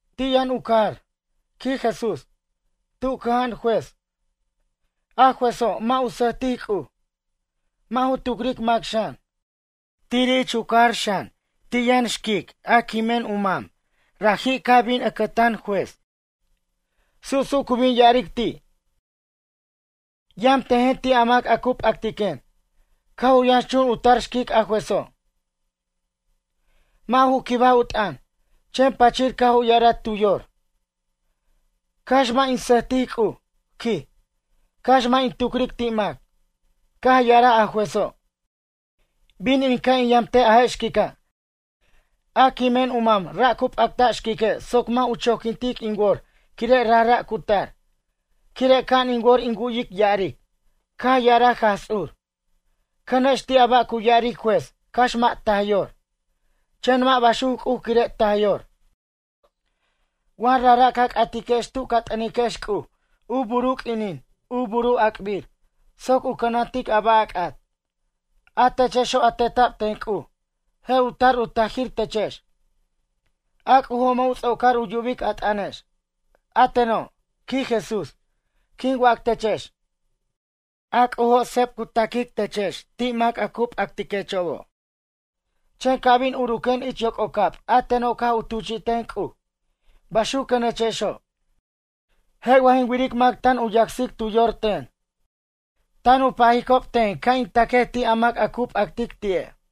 Ti' yʌn u cajar ―quij Jesús―, tu cʌja'an juez. A juezo', mʌ' u sʌjtic C'uj, mʌ' ju tucric mac xan. Tiri' ich u cajar xan, ti' yʌn xquic, quimen u mam raji' caj bin ʌcʌtan juez. Su' su' cu bin ya'aric ti': “Yʌmtejen ti' a mac a cu p'actiquen.” Caj u yʌnxchun u tar xquic a juezo', mʌ' ju quibaj u t'ʌn. Chen pachir caj u ya'araj tu yor: “Cax mʌ' in sʌjtic C'uj ―quij―, cax mʌ' in tucric ti' mac.” Caj ya'araj a juezo': “Bin in ca' in yamtej a je' xquica', a quimen u mam ra' cu p'acta' xquique' soc mʌ' u choquintic in wor quire' rajra' cu tar. Quire' ca'an in wor in wu'yic ya'aric.” Caj ya'araj Jaj Ts'ur: ―Cʌnex ti' a ba' cu ya'aric juez cax mʌ' taj yor. Chen mʌ' baxuc C'uj quire' taj yor. Wa rajra' ca c'atiquex tu ca t'ʌniquex C'uj u bur u q'uinin u bur u ac'bir soc u cʌnantic a ba' a c'at. A techexo' a teta'b ten C'uj, je' u tar u tajir techex. A C'ujo' mʌ' u ts'ocar u yubic a t'ʌnex. A teno' ―quij Jesús―, quin wac techex. A C'ujo' seb cu ta'quic techex mac ti' a cu p'acti'echobo'. Chen ca' bin uruquen ich yoc'ocab a teno' caj u tuchi'ten C'uj, baxuquenechexo'. Je' wa jin wiric mac tan u yacsic tu yor ten. Tan u pajicob ten ca' in ta'quej ti' a mac a cu p'actic ti'e'.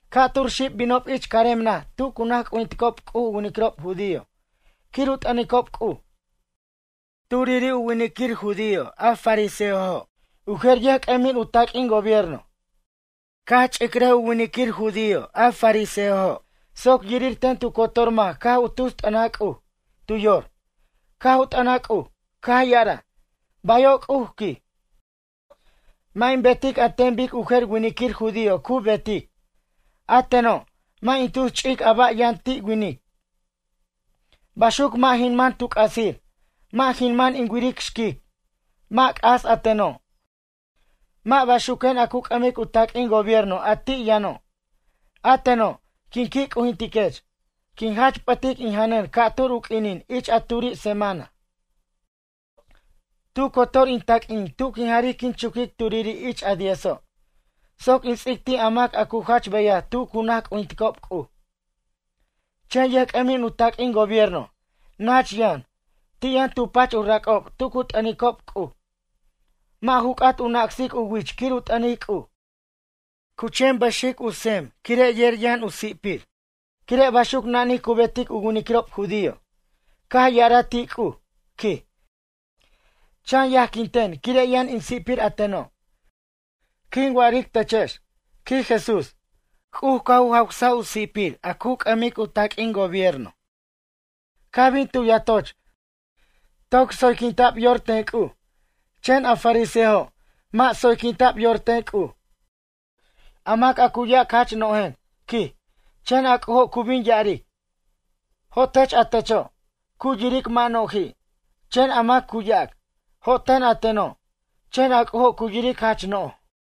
―Ca'tur xib binob ich carem naj tu cu naj c'ujinticob C'uj u winiquirob judío quir u t'ʌnicob C'uj. Turiri' u winiquir judío a fariseojo', u jer yʌjc'ʌmin u taq'uin gobierno. Caj ch'iraj u winiquir judío a fariseojo' soc yirir ten tu cotor mac caj u tus t'ʌnaj C'uj. Tu yor, caj u t'ʌnaj C'uj, caj ya'araj: “Bayo' C'uj ―quij―, mʌ' in betic an ten bic u jer winiquir judío cu betic. A teno', mʌ' in tus ch'ic a ba' yʌn ti' winic. Baxuc mʌ' jin man tu c'asir, mʌ' jin man in wiric xquic, mʌ' c'as a teno'. Mʌ' baxuquen a cu c'ʌmic u taq'uin gobierno a ti' yʌno'. A teno', quin qui' c'ujintiquech, quin jamach p'ʌtic in janʌn ca'tur u q'uinin ich a turi' semana. Tu cotor in taq'uin tu quin jaric quin chuquic turiri' ich a diezo' soc in ts'ic ti' a mac a cu jach beyaj tu cu naj c'ujinticob C'uj.” Chen yʌjc'ʌmin u taq'uin gobierno, nach yʌn. Ti' yʌn tu pach u rac'ob tu cu t'ʌnicob C'uj. Mʌ' ju c'at u nacsic u wich quir u t'ʌnic C'uj. Cu chen pʌxic u tsem quire' yer yʌn u si'pir. Quire' baxuc nanij cu betic u winiquirob judío. Caj ya'araj ti' C'uj ―quij―: “Chan yajquin ten quire' yʌn in si'pir a teno'.” Quin wa'aric techex ―quij Jesús―, C'uj caj u jawsaj u si'pir a cu c'ʌmic u taq'uin gobierno. Caj bin tu yatoch toc tsoyquinta'b yor ten C'uj. Chen a fariseojo', mʌ' tsoyquinta'b yor ten C'uj. A mac a cu yac jach no'jen ―quij―, chen a C'ujo' cu bin ya'aric: “Jo'tech a techo'”, cu yiric mʌ' no'ji'. Chen a mac cu yac: “Jo'ten a teno'.” Chen a C'ujo' cu yiric jach no'j.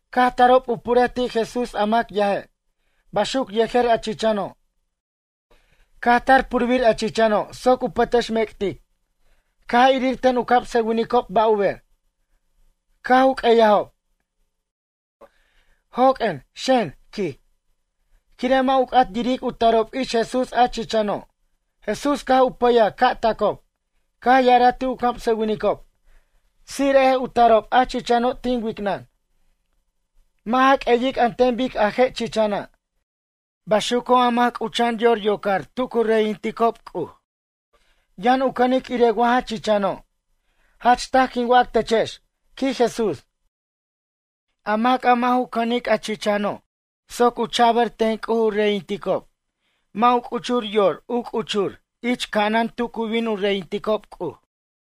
Caj tarob u purej ti' Jesús a mac yaje', baxuc yejer a chichano'. Caj tar purbir a chichano' soc u pʌtʌxmec'tic. Caj irir ten u camsʌwinicob ba' u ber. Caj u q'uejajob: ―Joq'uen, xen ―quij. Quire' mʌ' u c'at yiric u tarob ich Jesús a chichano'. Jesús caj u pʌyaj ca' tacob. Caj ya'araj ti' u camsʌwinicob: ―Ts'ire'ej u tarob a chichano' tin wicnʌn. Mʌ' ja q'ueyic an ten bic a je' chichana'. Baxuco' a mac c'ucha'an yor yocor tu cu reyinticob C'uj. Yʌn u cʌnic irej wa ja chichano'. Jach taj quin wac techex ―quij Jesús―. A mac a mʌ' ju cʌnic a chichano' soc u chabar ten C'uj u reyinticob mʌ' u c'uchur yor, u c'uchur ich ca'anan tu cu bin u reyinticob C'uj.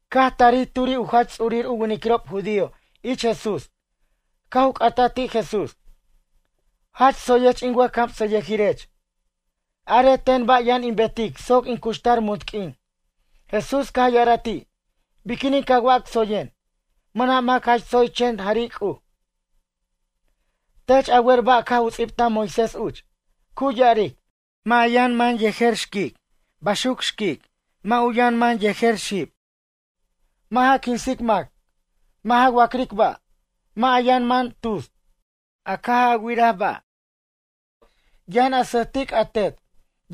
Caj tarij turi' u jach ts'urir u winiquirob judío ich Jesús. Caj u c'ataj ti' Jesús: ―Jach tsoyech in wʌjcamsʌyʌjirech. Arej ten ba' yʌn in betic soc in cuxtar munt q'uin? Jesús caj ya'araj ti': ―Biquinin ca wac tsoyen? Mʌna' mac jach tsoy chen jari' C'uj. Tech a wer ba' caj u ts'ibtaj Moisés uch. Cu ya'aric: “Mʌ' a yʌn man yejer xquic baxuc xquic, mʌ' u yʌn man yejer xib. Mʌ' ja quinsic mac. Mʌ' ja wac'ric ba'. Mʌ' a yʌn man tus, a caj a wiraj ba'. Yʌn a sʌjtic a tet,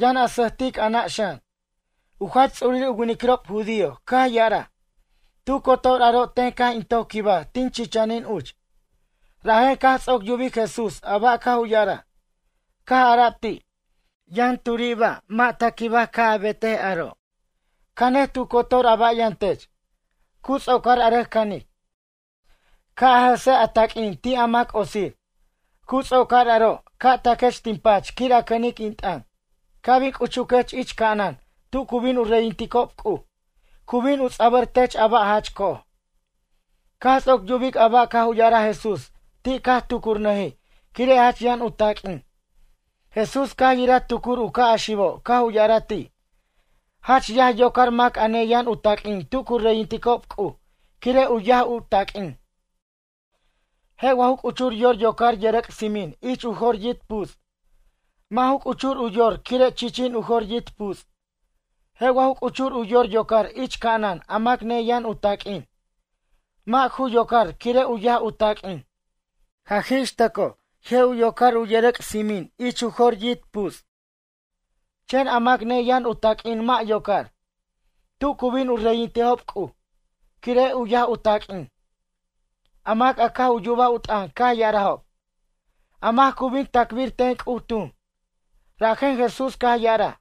yʌn a sʌjtic a nʌ' xan.” U jach ts'urir u winiquirob judío caj ya'araj: ―Tu cotor aro' ten caj in toc quibaj tin chichanin uch. Rajen caj ts'oc yubic Jesús a ba' caj u ya'araj. Caj ara'b ti': ―Yʌn turi' ba' mʌ' ta quibaj ca' a betej aro'. Canej tu cotor a ba' yʌn tech. Cu ts'ocar a rʌc canic, ca' a jʌsej a taq'uin ti' a mac otsir. Cu ts'ocar aro', ca' taquech tin pach quir a cʌnic in t'ʌn. Ca' bin c'uchuquech ich ca'anan tu cu bin u reyinticob C'uj. Cu bin u ts'abʌr tech a ba' jach co'oj. Caj ts'oc yubic a ba' caj u ya'araj Jesús ti' caj tucurnʌjij quire' jach yʌn u taq'uin. Jesús caj yiraj tucur u ca' a xibo' caj u ya'araj ti': ―Jach yaj yocar mac a neyʌn u taq'uin tu cu reyinticob C'uj quire' u yaj u taq'uin. Je' wa ju c'uchur yor yocar yʌrʌc' tsimin ich u jor yit' puts'? Mʌ' ju c'uchur u yor quire' chichin u jor yit' puts'. Je' wa ju c'uchur u yor yocar ich ca'anan a mac neyʌn u taq'uin? Mʌ' ju yocar quire' u yaj u taq'uin. Jaj ixtʌcoj, je' u yocar yʌrʌc' tsimin ich u jor yit' puts'. Chen a mac neyʌn u taq'uin mʌ' yocar, tu cu bin u reyintejob C'uj, quire' u yaj u taq'uin. A mac a caj u yubaj u t'ʌn caj ya'arajob: ―A mac cu bin ta'cbir ten C'uj tun? Rajen Jesús caj ya'araj: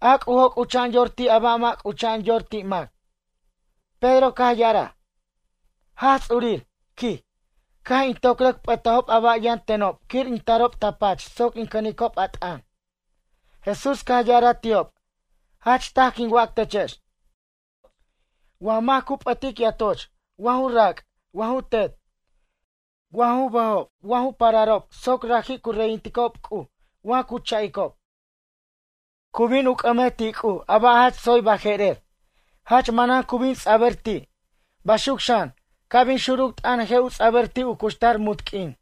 ―A C'ujo' c'ucha'an yor ti' a ba' mʌ' c'ucha'an yor ti' mac. Pedro caj ya'araj: ―Jaj Ts'urir ―quij―, caj in toc rʌc p'ʌtajob a ba' yʌn tenob quir in tarob ta pach soc in cʌnicob a t'ʌn. Jesús caj ya'araj ti'ob: ―Jach taj quin wac techex. Wa mac cu p'ʌtic yatoch wa ju rac' wa ju tet. Wa ju bʌjob wa ju pararob soc raji' cu reyinticob C'uj wa cu cha'icob. Cu bin u c'ʌmej ti' C'uj a ba' jach tsoy baje'rer. Jach manan cu bin ts'abʌr ti'. Baxuc xan, ca' bin xuruc t'ʌn je' u ts'abʌr ti' u cuxtar munt q'uin.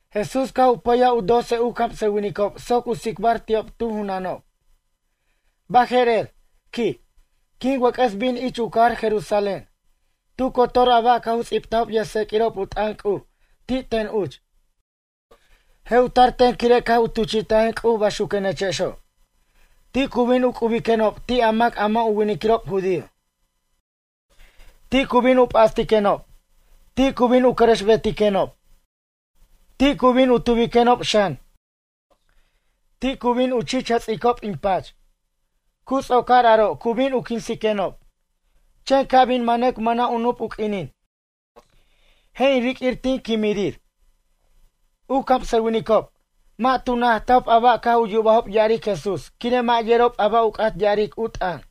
Jesús caj u pʌyaj u doce u camsʌwinicob soc u tsicbar ti'ob tu junanob: ―Baje'rer ―quij―, quic wʌc'ʌs bin ich u cajar Jerusalén. Tu cotor a ba' caj u ts'ibtajob yʌjtseq'uirob u t'ʌn C'uj ti' ten uch. Je' u tar ten quire' caj u tuchi'tajen C'uj baxuquenechexo'. Ti' cu bin u c'ubiquenob ti' a mac a mʌ' u winiquirob judío. Ti' cu bin u p'astiquenob. Ti' cu bin u cʌrʌxbetiquenob. Ti' cu bin u tubiquenob xan. Ti' cu bin u chich jʌts'icob in pach. Cu ts'ocar aro' cu bin u quinsiquenob. Chen ca' bin manʌc mʌna' u nup u q'uinin, je' in riq'uir tin quimirir. U camsʌwinicob, mʌ' tu najtajob a ba' caj u yubajob ya'aric Jesús quire' mʌ' yerob ba' u c'at ya'aric u t'ʌn.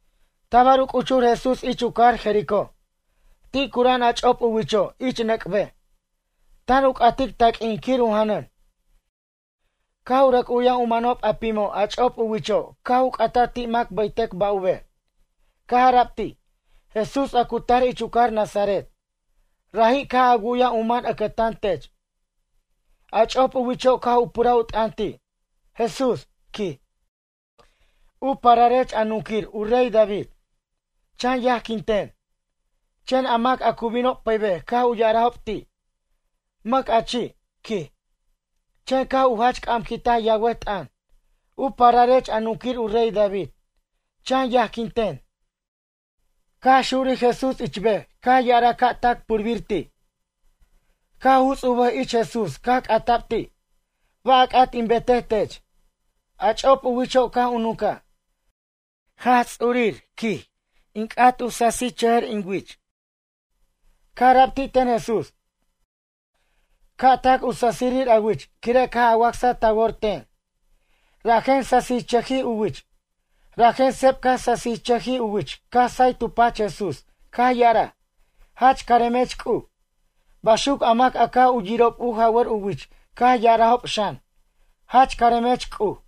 Tabar u c'uchur Jesús ich u cajar Jericó. Ti' cura'an a ch'op u wicho' ich nʌc' bej. Tan u c'atic u taq'uin quir u janʌn. Caj u rʌc u'yaj u manob a pimo' a ch'op u wicho' caj u c'ata ti' mac bʌytʌc ba' u ber. Caj ara'b ti': ―Jesús a cu tar ich u cajar Nazaret, raji' caj a wu'yaj u man ʌcʌtan tech. A ch'op u wicho' caj u puraj u t'ʌn ti': ―Jesús ―quij―, u pararech a nunquir u rey David, chan yajquin ten. Chen a mac a cu binob pʌybej caj u ya'arajob ti': ―Mʌc a chi' ―quij. Chen caj u jach c'amquintaj yawʌt t'ʌn: ―U pararech a nunquir u rey David, chan yajquint ten. Caj xurij Jesús ich bej caj ya'araj ca' tac purbir ti'. Caj u juts' u bʌj ich Jesús caj c'ata'b ti': ―Ba' a c'at in betej tech? A ch'op u wicho' caj u nuncaj: ―Jaj Ts'urir ―quij―, in c'at u sasichʌjʌr in wich. Caj ara'b ti' ten Jesús: ―Ca' tac u sasirir a wich quire' caj a wacsaj ta wor ten. Rajen sasichʌjij u wich. Rajen seb caj sasichʌjij u wich caj say tu pach Jesús caj ya'araj: ―Jach caremech C'uj. Baxuc a mac a caj u yirob u jawʌr u wich caj ya'arajob xan: ―Jach caremech C'uj.